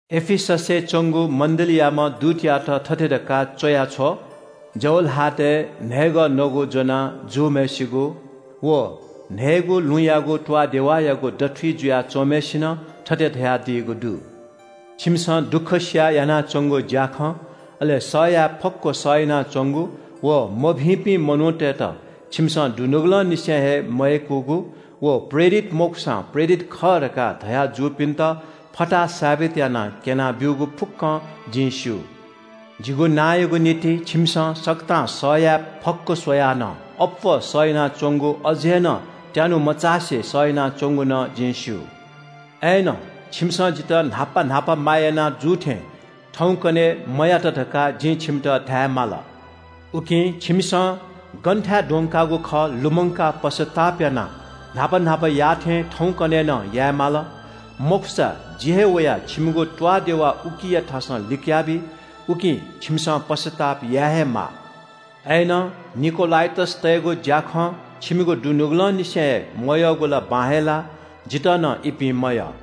“एफिससय् च्‍वंगु मण्‍डलीयाम्‍ह दूतयात थथे धकाः च्‍वया छ्व – जव ल्‍हातय् न्‍हय्‌गः नगु ज्‍वना जूम्‍हय्‌सिगु व न्‍हय्‌गू लुँयागु त्‍वाःदेवायागु दथुइ जुया च्‍वंम्‍हय्‌सिनं थथे धयादीगु दु – “छिमिसं दुःख सियाः यानाच्‍वंगु ज्‍याखँ, अले सह याये फक्‍व सह यानाच्‍वंगु व मभिंपिं मनूतय्‌त छिमिसं दुनुगलंनिसें हे मयय्‌कूगु, व प्रेरित मखुसां प्रेरित खः धकाः धया जूपिन्‍त फताहा सावित यानाः क्‍यनाब्‍यूगु फुक्‍कं जिं स्‍यू। जिगु नांयागु निंतिं छिमिसं सकतां सह याये फक्‍व स्‍वयाः नं अप्‍वः सह यानाच्‍वंगु अझ हे नं त्‍यानु मचासे सह यानाच्‍वंगु नं जिं स्‍यू। “अय्‌नं छिमिसं जितः न्‍हापा न्‍हापा माया याना जू थें थौंकन्‍हय् मयात धकाः जिं छिमित धायेमाल। उकिं छिमिसं गनथाय् द्वंकागु खः लुमंकाः पश्‍चाताप यानाः न्‍हापा न्‍हापा याःथें थौंकन्‍हय् नं याये माल। मखुसा जि हे वयाः छिमिगु त्‍वाःदेवा उकिया थासं लिकयाबी। उकिं छिमिसं पश्‍चाताप याये हे माः। अय्‌नं निकोलाइटसतय्‌गु ज्‍याखँ छिमिगु दुनुगलंनिसें हे मयःगु ला बां हे लाः। जितः नं इपिं मयः।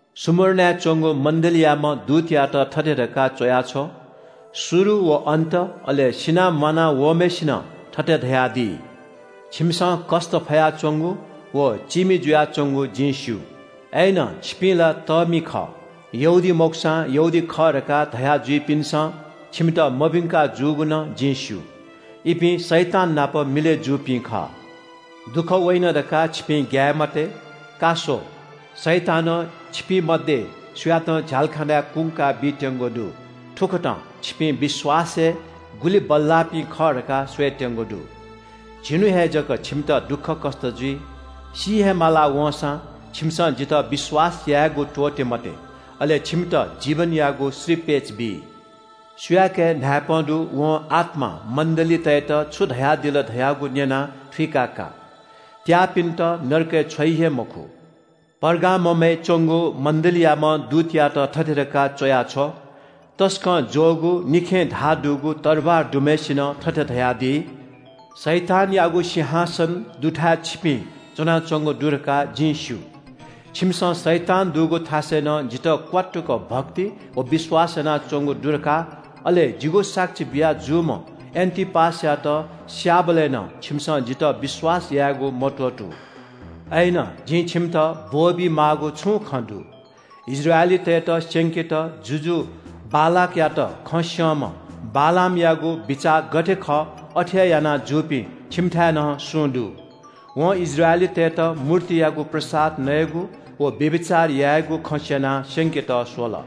“स्‍मुर्नाय् च्‍वंगु मण्‍डलीयाम्‍ह दूतयात थथे धकाः च्‍वया छ्व – शुरु व अन्‍त, अले सिनाः म्‍वाना वःम्‍हय्‌सिनं थथे धयादी – “छिमिसं कष्‍ट फयाच्‍वंगु व चीमि जुयाच्‍वंगु जिं स्‍यू। अय्‌नं छिपिं ला तःमि खः। यहूदी मखुसां यहूदी खः धकाः धया जुइपिन्‍सं छिमित मभिंका जूगु नं जिं स्‍यू। इपिं शैतान नाप मिलय् जूपिं खः। दुःख वइन धकाः छिपिं ग्‍याये मते। का स्‍व, शैतानं छिपिं मध्‍ये सुयातं झ्‍यालखानाय् कुंका बीत्‍यंगु दु। थुकथं छिपिं विश्‍वासय् गुलि बल्‍लाःपिं खः धकाः स्‍वयेत्‍यंगु दु। झिन्‍हु हे जक छिमित दुःखकष्‍ट जुइ। सी हे माला वंसां छिमिसं जितः विश्‍वास यायेगु त्‍वःते मते, अले छिमित जीवनयागु श्रीपेच बी। “सुयाके न्‍हाय्‌पं दु वं आत्‍मां मण्‍डलीतय्‌त छु धयादिल धयागु न्‍यनाः थुइकाः का – त्‍याःपिन्‍त नरकय् छ्वइ हे मखु। “पर्गाममय् च्‍वंगु मण्‍डलीयाम्‍ह दूतयात थथे धकाः च्‍वया छ्व – तसकं ज्‍वःगु निखें धाः दुगु तरवार दुम्‍हय्‌सिनं थथे धयादी – “शैतानयागु सिंहासन दुथाय् छिपिं च्‍वनाच्‍वंगु दु धकाः जिं स्‍यू। छिमिसं शैतान दुगु थासय् नं जितः क्‍वात्तुक भक्ति व विश्‍वास यानाच्‍वंगु दु धकाः, अले जिगु साक्षी बिया जूम्‍ह एन्‍टिपासयात स्‍याःबलय् नं छिमिसं जितः विश्‍वास यायेगु मत्‍वःतू। “अय्‌नं जिं छिमित ब्‍वःबी माःगु छुं खँ दु। इस्राएलीतय्‌त स्‍यंकेत जुजु बालाकयात खँ स्‍यंम्‍ह बालामयागु बिचाः गथे खः अथे हे याना जूपिं छिमिथाय् नं सुं दु। वं इस्राएलीतय्‌त मूर्तियागु प्रसाद नयेगु व व्‍यभिचार यायेगु खँ स्‍यनाः स्‍यंकेत स्‍वल।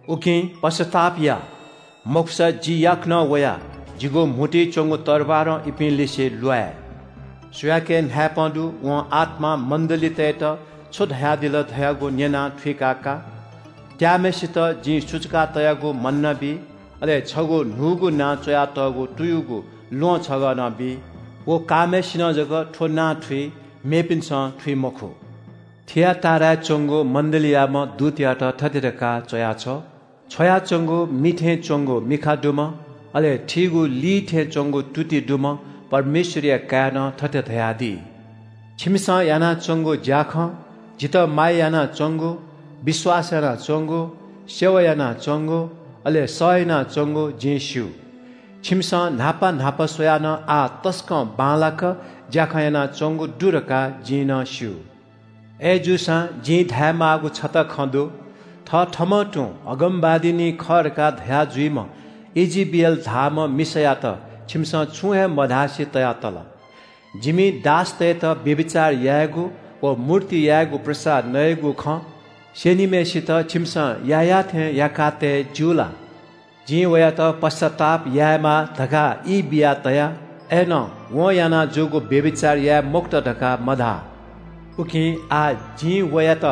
उकिं पश्‍चाताप या, मखुसा जि याकनं वयाः जिगु म्‍हुतुइ च्‍वंगु तरवारं इपिं लिसे ल्‍वाये। “सुयाके न्‍हाय्‌पं दु वं आत्‍मां मण्‍डलीतय्‌त छु धयादिल धयागु न्‍यनाः थुइकाः का – त्‍याःम्‍हय्‌सित जिं सुचुका तयागु मन्‍ना बी। अले छगू न्‍हूगु नां च्‍वयातःगु तुयुगु ल्‍वहं छगः नं बी। व काःम्‍हय्‌सिनं जक थ्‍व नां थुइ, मेपिन्‍सं थुइ मखु। “थिआटीराय् च्‍वंगु मण्‍डलीयाम्‍ह दूतयात थथे धकाः च्‍वया छ्व – छ्वयाच्‍वंगु मि थें च्‍वंगु मिखा दुम्‍ह, अले थीगु ली थें च्‍वंगु तुति दुम्‍ह परमेश्‍वरया काय्‌नं थथे धयादी – “छिमिसं यानाच्‍वंगु ज्‍याखँ, जितः माया यानाच्‍वंगु, विश्‍वास यानाच्‍वंगु, सेवा यानाच्‍वंगु, अले सह यानाच्‍वंगु जिं स्‍यू। छिमिसं न्‍हापा न्‍हापा स्‍वयाः नं आः तसकं बांलाक ज्‍याखँ यानाच्‍वंगु दु धकाः जिं नं स्‍यू। “अय्‌जूसां जिं धायेमाःगु छता खँ दु। थथःम्‍हं तुं अगमवादिनी खः धकाः धया जुइम्‍ह ईजेबेल धाःम्‍ह मिसायात छिमिसं छुं हे मधासे तया तल। जिमि दासतय्‌त व्‍यभिचार यायेगु व मूर्तियागु प्रसाद नयेगु खँ स्‍यनीम्‍हय्‌सित छिमिसं याःयाःथे याकातये ज्‍यू ला? जिं वयात पश्‍चाताप यायेमा धकाः ई बिया तया। अय्‌नं वं याना जूगु व्‍यभिचार याये मखुत धकाः मधाः। “उकिं आः जिं वयात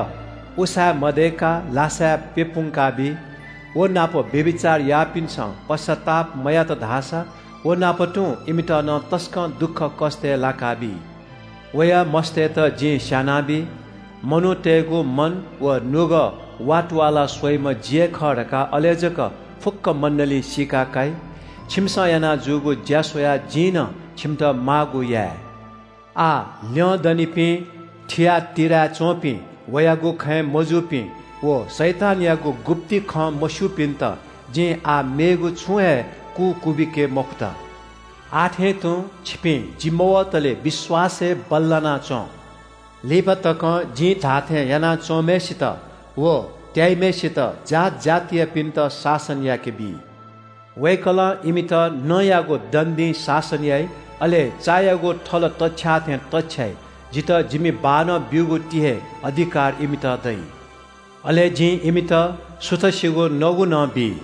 उसाँय् मदय्‌काः लासाय् प्‍यपुंकाबी। व नाप व्‍यभिचार याःपिन्‍सं पश्‍चाताप मयात धाःसा व नाप तुं इमित नं तसकं दुःखकष्‍टय् लाकाबी। वया मस्‍तय्‌त जिं स्‍यानाबी। मनूतय्‌गु मन व नुगः वातुवालाः स्‍वइम्‍ह जि हे खः धकाः अले जक फुक्‍क मण्‍डलीं सीका काइ। छिमिसं याना जूगु ज्‍या स्‍वयाः जिं नं छिमित माःगु याये। “आः ल्‍यंदनिपिं थिआटीराय् च्‍वंपिं वयागु खँय् मजूपिं व शैतानयागु गुप्‍ति खँ मस्‍यूपिन्‍त जिं आः मेगु छुं हे कु क्‍वबिके मखुत। आः थें तुं छिपिं जि मवतले विश्‍वासय् बल्‍लाना च्‍वँ। “लिपा तकं जिं धाःथे यानाच्‍वंम्‍हय्‌सित व त्‍याइम्‍हय्‌सित जात जातियापिन्‍त शासन याकेबी। वय्‌कलं इमित नँयागु दण्‍डीं शासन याइ, अले चायागु थल तछ्याः थें तछ्याइ। जितः जिमि बाःनं ब्‍यूगु ति हे अधिकार इमित दइ। अले जिं इमित सुथसिगु नगु नं बी।